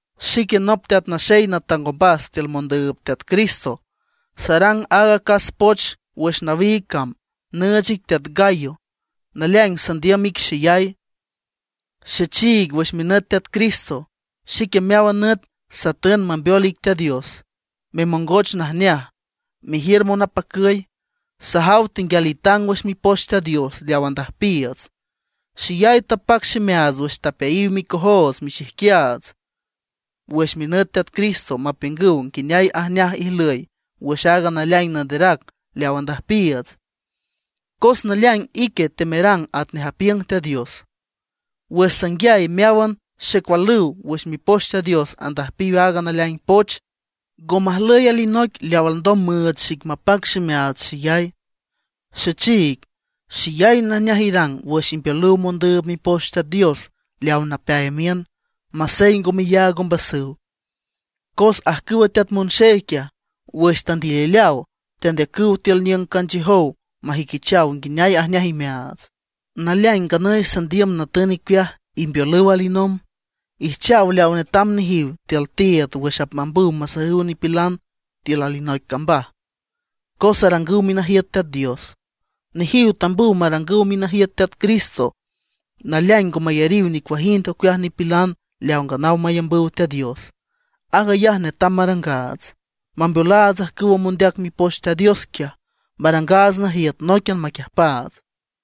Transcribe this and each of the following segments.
Xique nop teat naxey natang ombas tiül mondüüb Teat Cristo; sarang aaga acas poch wüx nawiig cam nüüch ic teat Gayo, naleaing sandiüm ic xeyay. Xechiig wüx minüt Teat Cristo, xique meáwan nüt satün mambeol ic Teat Dios memongoch najneaj, mejiür monapacüy. Sajaw tenguial itang wüx Mipoch Teat Dios leaw andüjpiiüts. Xeyay tapac ximeaats wüx tapeayiw micojoots michijquiaats wüx minüt Teat Cristo mapiüngüw nguineay ajneaj ijlüy wüx aaga naleaing nanderac leaw andüjpiiüts, cos naleaing ique temerang atnej apiüng Teat Dios. Wüx sanguiay meáwan xecualüw wüx Mipoch Teat Dios andüjpiw aaga naleaing poch, ngo majlüy alinoic leaw alndom müüch xic mapac ximeaats xeyay. Xechiig, xeyay najneaj irang wüx imbeolüw mondüüb Mipoch Teat Dios leaw napeay miün, masey ngo meyaag ombasüw. Cos ajcüwa teat monxey quiaj, wüx tandilileaw tandeacüw tiül niüng canchiüjow majüiquichaw nguineay ajneaj imeaats. Naleaing nganüy sandiüm natün icueaj imbeolüw alinomb; ijchaw leaw netam nejiw tiül tiiüd wüx apmambüw masajüw nipilan tiül alinoic cambaj, cos arangüw minajiüt Teat Dios. Nejiw tambüw marangüw minajiüt Teat Cristo, naleaing ngo mayariw nicuajind ocueaj nipilan leaw nganaw mayambüw Teat Dios. Aag ayaj netam marangaats, mambeolaats ajcüw mondeac Mipoch Teat Dios quiaj, marangaats najiüt nóiquian maquiüjpaats.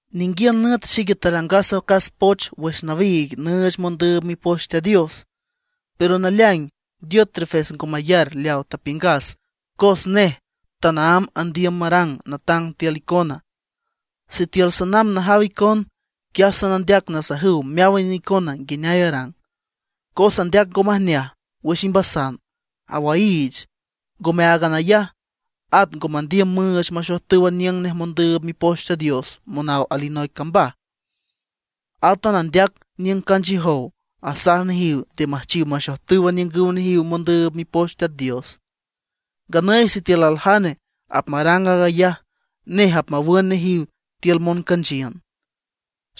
Ninguiün nüt xique tarangas acas poch wüx nawiig nüüch mondüüb Mipoch Teat Dios; pero naleaing Diótrefes ngo mayar leaw tapiüngas cos nej tanaámb andiüm marang natang tiül icona. Sitiül sanamb najaw icon, quiaj sanandeac nasajüw meáwan icona nguineay arang, cos andeac ngo majneaj wüx ximbasan, awaiich. Ngome áagan ayaj, at ngo mandiüm müüch maxojtüw aniüng nej mondüüb Mipoch Teat Dios monaw alinoic cambaj. Átan andeac niüng canchiüjow, asaj nejiw nde müjchiw maxojtüw aniüngüw nejiw mondüüb Mipoch Teat Dios. Nganüy sitiül aljane apmarang aag ayaj, nej apmawün nejiw tiül moncanchiün.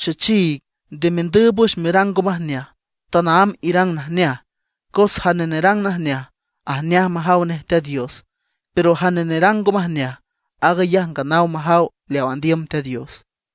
Xechiig, nde mendüüb wüx merang ngo majneaj, tanaámb irang najneaj. Cos jane nerang najneaj, ajneaj majaw nej Teat Dios; pero jane nerang ngo majneaj, aag ayaj nganaw majaw leaw andiüm Teat Dios.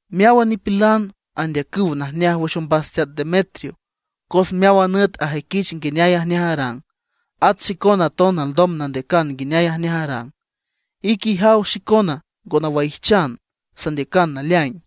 Meáwan nipilan andeacüw najneaj wüx ombas teat Demetrio, cos meáwan nüt ajüiquich nguineay ajneaj arang. At xicona aton alndom nandeacan nguineay ajneaj arang. Ique ijaw xicona ngo nawaijchan, sandeacan naleaing.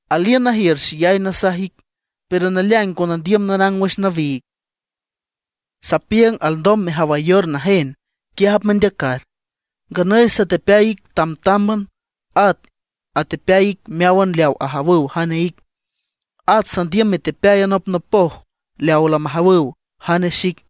Aliün najiür xeyay nasaj ic, pero naleaing ngo nandiüm narang wüx nawiig. Sapiüng alndom mejawayor najen, quiaj apmendeacar. Nganüy satepeay ic tamtámban, at atepeayiw ic meáwan leaw ajawüw jane ic. At sandiüm metepeay anopnopoj leaw lamajawüw jane xic.